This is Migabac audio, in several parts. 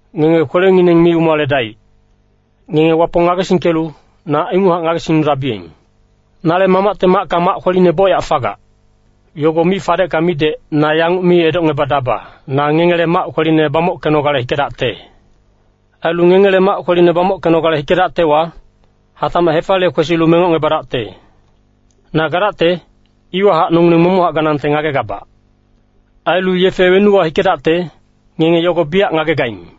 “Ngenge kwelengineng mi umaledaic. Ngenge Wapong ngagesingkelu, na inguchac ngagesingnudabiyeng. Nale Mamacte macka mac kweline bocyac fagac. Yogo mi fadecka midec, na yanguc mi edocngebadaba, ‘Na ngengele mac kweline bamockenogale hikedacte.’ Ailu ngengele mac kweline bamockenogale hikedactewa, hatacmac hefaliye kwesilu mengocngebadacte. Na gadacte, iwahac nongileng momochac ganangte ngagegabac. Ailu yefe wenuwa hikedacte, ngenge yogo biyac ngagegaing.”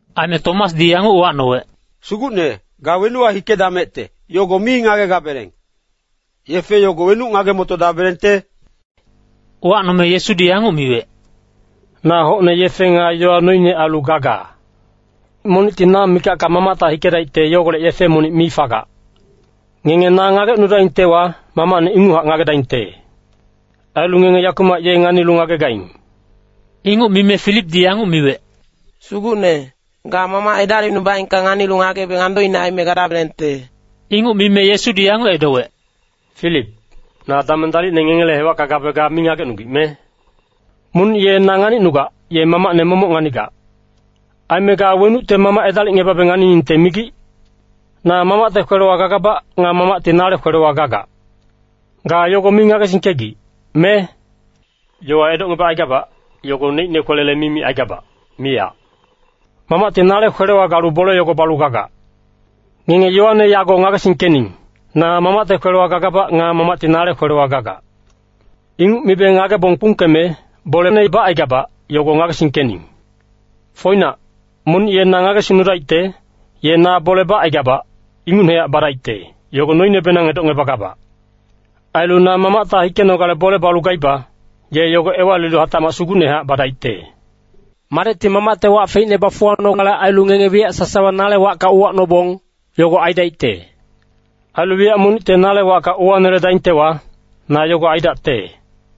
Aime Tomasdi yanguc uwacnowec, “Sugucne, ga wenuwa hikedamecte, yogo mi ngagegabeleng. Yefe yogo wenuc ngage-motodabelengte?” Uwacnome Yesudi yanguc miwec, “Na hocne yefe nga yowa noine ailu gaga. Monicti na mikacka Mamacta hikedaicte yogolec yefe monic mi fagac. Ngenge na ngagecnudaingtewa, Mamacne inguchac ngagedaingte. Ailu ngenge yakumac ye nganilu ngagegaing.” Inguc mime Filipdi yanguc miwec, “Sugucne, ga Mamac edalicnubaengka nganilu ngagebeng andoine aime gadabelengte.” Inguc mime Yesudi yanguc edowec, “Filip, na dameng dalicne ngengele hewacka gabe ga mi ngagecnugic, me? Monic ye na nganicnugac, ye Mamacne momoc nganigac. Aime ga wenucte Mamac edalicngebabe nganiningte migic? Na Mamacte kwelewa gagabac nga Mamacti nale kwelewa gagac. Ga yogo mi ngagesingkegic, me? Yowa edocngebacaigabac, yogo neicne kwelele mi micaigabac, miyac. Mamacti nale kwelewa galu bole yogo balu gagac. Ngenge yowane yago ngagesingkening, na Mamacte kwelewa gagabac nga Mamacti nale kwelewa gagac. Inguc mibe ngagebong kpungkeme, bolene bacaigabac, yogo ngagesingkening. “Foinac, monic ye na ngagesingnudaicte, ye na bole bacaigabac, ingucnehac badaicte, yogo noinebenang edocngebagabac. Ailu na Mamacta hikenogale bole balu gaiba, ye yogo ewalilu hatacmac sugucnehac badaicte. Madecti Mamacte wac feicne bafuwacnonale ailu ngenge wiyac sasawa nale wacka uwacnobong, yogo aidacte. Ailu wiyac monicte nale wacka uwaneledaingtewa, na yogo aidacte.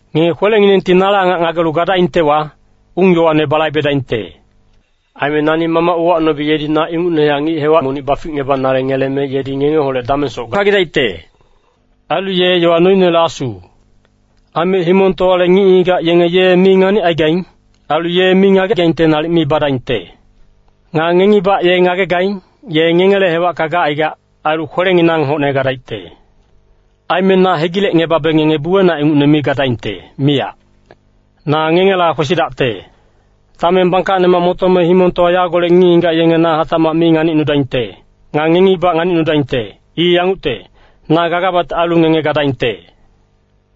“Ngenge kwelenginengti nale angac ngagelu gadaingtewa, ung-yowane balaibedaingte. Aime nani Mamac uwacnobe yedi na ingucnehac ngic-hewac monic baficngebanale ngeleme yedi ngengeholec damengsoc gagidaicte. Ailu ye yowa noinele Asu. Aime himongtowale ngic-ngigac yenge ye mi nganicaigaing. Ailu ye mi ngagegaingte nalic mi badaingte. Nga ngengibac ye ngagegaing, ye ngengele hewacka gacaigac, ailu kwelenginang hocne gadaicte. Aime na hegilecngebabe ngenge buwenac ingucne mi gadaingte, miyac. Na ngengela kwesidacte. Dameng bangkacnemac motome himongtowa yagolec ngic-ngigac yenge na hatacmac mi nganicnudaingte. Nga ngengibac nganicnudaingte. I yangucte, na gagabacte ailu ngenge gadaingte.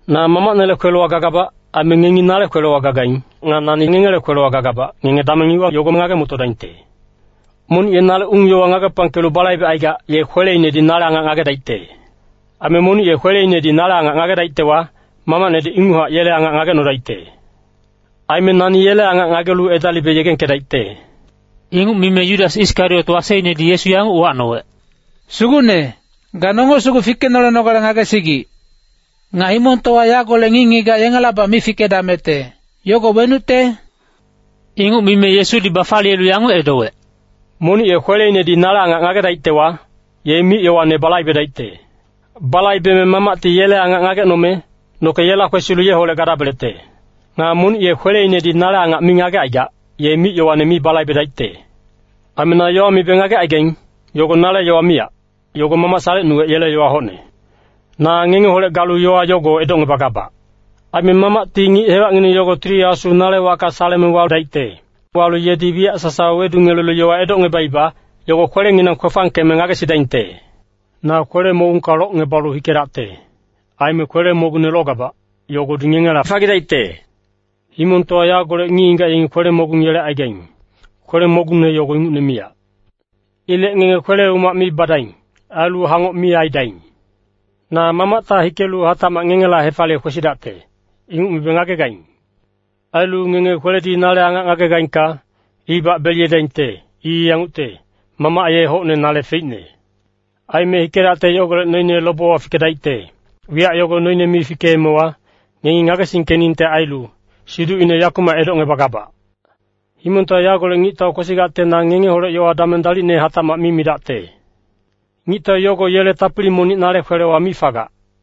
Na Mamacnele kwelewa gagabac. Aime ngenge nale kwelewa gagaing. Nga nani ngengele kwelewa gagabac, ngenge dameng iwa yogo ngage-motodaingte. “Monic ye nale ung-yowa ngagepangkelu balaibecaigac, ye kweleinedi nale angac ngagedaicte. Aime monic ye kweleinedi nale angac ngagedaictewa, Mamacnedi inguchac yele angac ngagecnodaicte. Aime nani yele angac ngagelu edalibe yegengkedaicte.” Inguc mime Yudas Iskariot waseinedi Yesu yanguc uwacnowec, “Sugucne, ga nonge sugu fikenolenogale ngagesigic. Nga himongtowa yagolec ngic-ngigac yengelabac mi fikedamecte, yogo wenucte?” Inguc mime Yesudi bafaliyelu yanguc edowec, “Monic ye kweleinedi nale angac ngagedaictewa, ye mic-yowane balaibedaicte. Balaibeme Mamacti yele angac ngagecnome, noke yela kwesilu yeholec gadabelecte. Nga monic ye kweleinedi nale angac mi ngagecaigac, ye mic-yowane mi balaibedaicte. Aime na yowa mibe ngagecaigaing, yogo nale yowa miyac, yogo Mamac salecnuwec yele yowa hocne. “Na ngengeholec galu yowa yogo edocngebagabac. Aime Mamacti ngic-hewacngineng yogo Tili Asu nale wacka saleme wadaicte. Walu yedi wiyac sasawa wedungelelu yowa edocngebaiba, yogo kwelenginang kwefangkeme ngagesidaingte. Na kwele-mogungka locngebalu hikedacte. Aime kwele-mogungne logabac, yogodi ngengela fagidaicte. Himongtowa yagolec ngic-ngigac yengi kwele-mogung yelecaigaing, kwele-mogungne yogo ingucne miyac. Ilec ngenge kwele-umac mi badaing. Ailu hangoc mi aidaing. “Na Mamacta hikelu hatacmac ngengela hefaliye kwesidacte, inguc mibe ngagegaing. Ailu ngenge kweledi nale angac ngagegaingka, ibac beliyedaingte. I yangucte, Mamac ye hocne nale feicne. Aime hikedacte yogolec noine lobewa fikedaicte, wiyac yogo noine mi fikeemewa, ngengi ngagesingkeningte ailu siducine yakumac edocngebagabac. “Himongtowa yagolec ngictau kwesigacte na ngengeholec yowa dameng dalicne hatacmac mi midacte. Ngictau yogo yele tapili monic nale kwelewa mi fagac.